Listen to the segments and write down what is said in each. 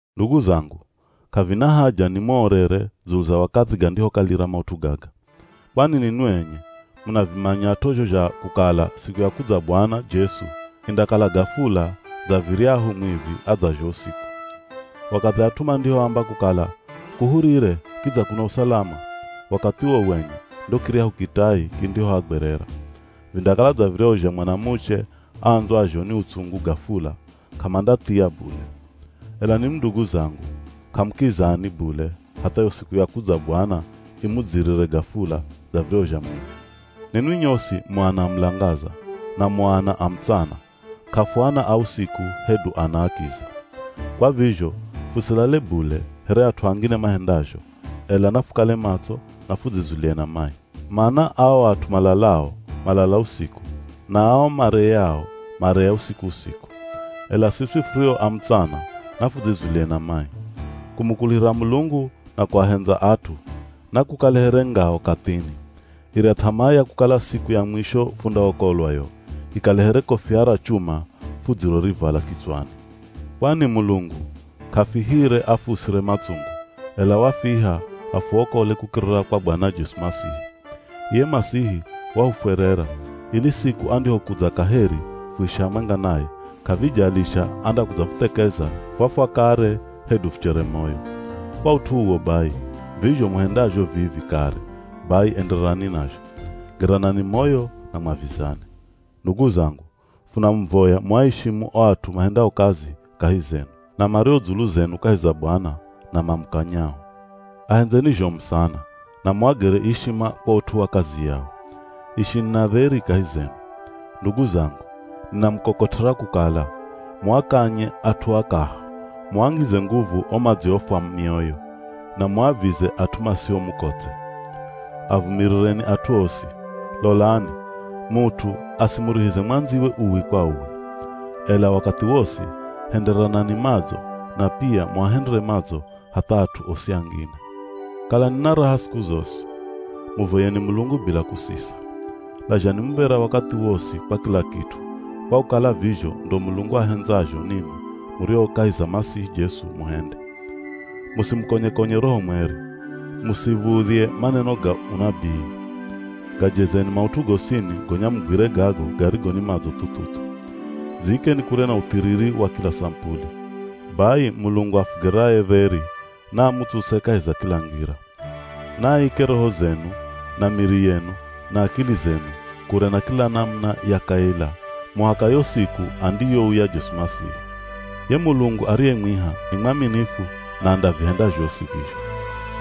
Ndugu zangu, k'avina haja ni muorere dzulu za wakathi gandihokalira maut'u gaga. Kwani ninwi enye munavimanyat'o zho zha kukala siku ya kudza Bwana Jesu indakala gafula dza viryahu mwivi adzazho usiku. Wakathi at'u mandihoamba kukala “Kuhurire kidza kuna usalama.” Wakathi uwo wenye ndo kiryahu kitai kindihoagwerera. Vindakala dza viryahu zha mwanamuche aandzwazho ni utsungu gafula, k'amandathia bule. Ela ninwi ndugu zangu k'amukizani bule hatha yo siku ya kudza Bwana imudzirire gafula dza viryahu zha mwivi. Ninwi nyosi mu ana a mulangaza, na mu ana a mutsana, k'afuana a usiku hedu ana a kiza. Kwa vizho fusilale bule here at'u angine mahendazho, ela na fukale matso na fudzizulie na mai. Mana ao at'u malalao, malala usiku, na ao mareyao mareya usiku-usiku. Ela siswi furio a mutsana, na fudzizulie na mai. Kumukuluhira Mulungu na kuahendza at'u, nakukale here ngao kathini. Irya th'amaa ya kukala siku ya mwisho fundaokolwa yo, ikale here kofia ra chuma fudzirorivala kitswani. Kwani Mulungu k'afihire afuusire matsungu, ela wafiha afuokole kukirira kwa Bwana Jesu Masihi. Iye Masihi wahufwerera, ili siku andihokudza kaheri fuishi hamwenga naye, k'avijalisha andakudzafuthekeza fwafwa kare hedu fuchere moyo. Kwa ut'u uwo bai, vizho muhendazho vivi kare bai endererani nazho. Geranani moyo na mwavizane. Ndugu zangu funamuvoya muaishimu o at'u mahendao kazi kahi zenu, na mario dzulu zenu kahi za Bwana na mamukanyao. Ahendzeni zhomu sana, na muagere ishima kwa ut'u wa kazi yao. Ishini na dheri kahi zenu. Ndugu zangu, ninamukokot'era kukala muakanye at'u akaha, muangize nguvu o madziofwa mioyo, na muavize at'u masio mukotse. Avumirireni at'u osi. Lolani, mut'u asimurihize mwandziwe uwi kwa uwi. Ela wakathi wosi henderanani madzo na pia muahendere madzo hatha at'u osi angine. Kalani na raha siku zosi. Muvoyeni Mulungu bila kusisa. Lazhani muv̱era wakathi wosi kwa kila kit'u, kwa kukala vizho ndo Mulungu ahendzazho ninwi murio kahi za Masihi Jesu muhende. Musimukonye-konye Roho Mweri. Musiv̱udhye maneno ga unabii. Gajezeni maut'u gosini gonya mugwire gago garigo ni madzo thu-thu-thu. Dziikeni kure na uthiriri wa kila samupuli. Bai Mulungu afugeraye dheri naamuutsuse kahi za kila ngira. Naaike roho zenu, na miri yenu, na akili zenu kure na kila namuna ya kaila muhaka yo siku andiyouya Jesu Masihi. Ye Mulungu ariyemwiha ni mwaminifu na andavihenda zhosi vizho.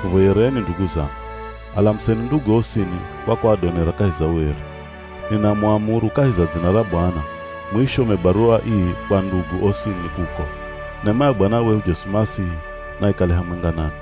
Fuvoyereni ndugu zangu. Alamuseni ndugu osini kwa kuadonera kahi za ueri. Ninamuamuru kahi za dzina ra Bwana muishome baruwa ii kwa ndugu osini kuko. Nema ya Bwana wehu Jesu Masihi naikale hamwenga nanwi.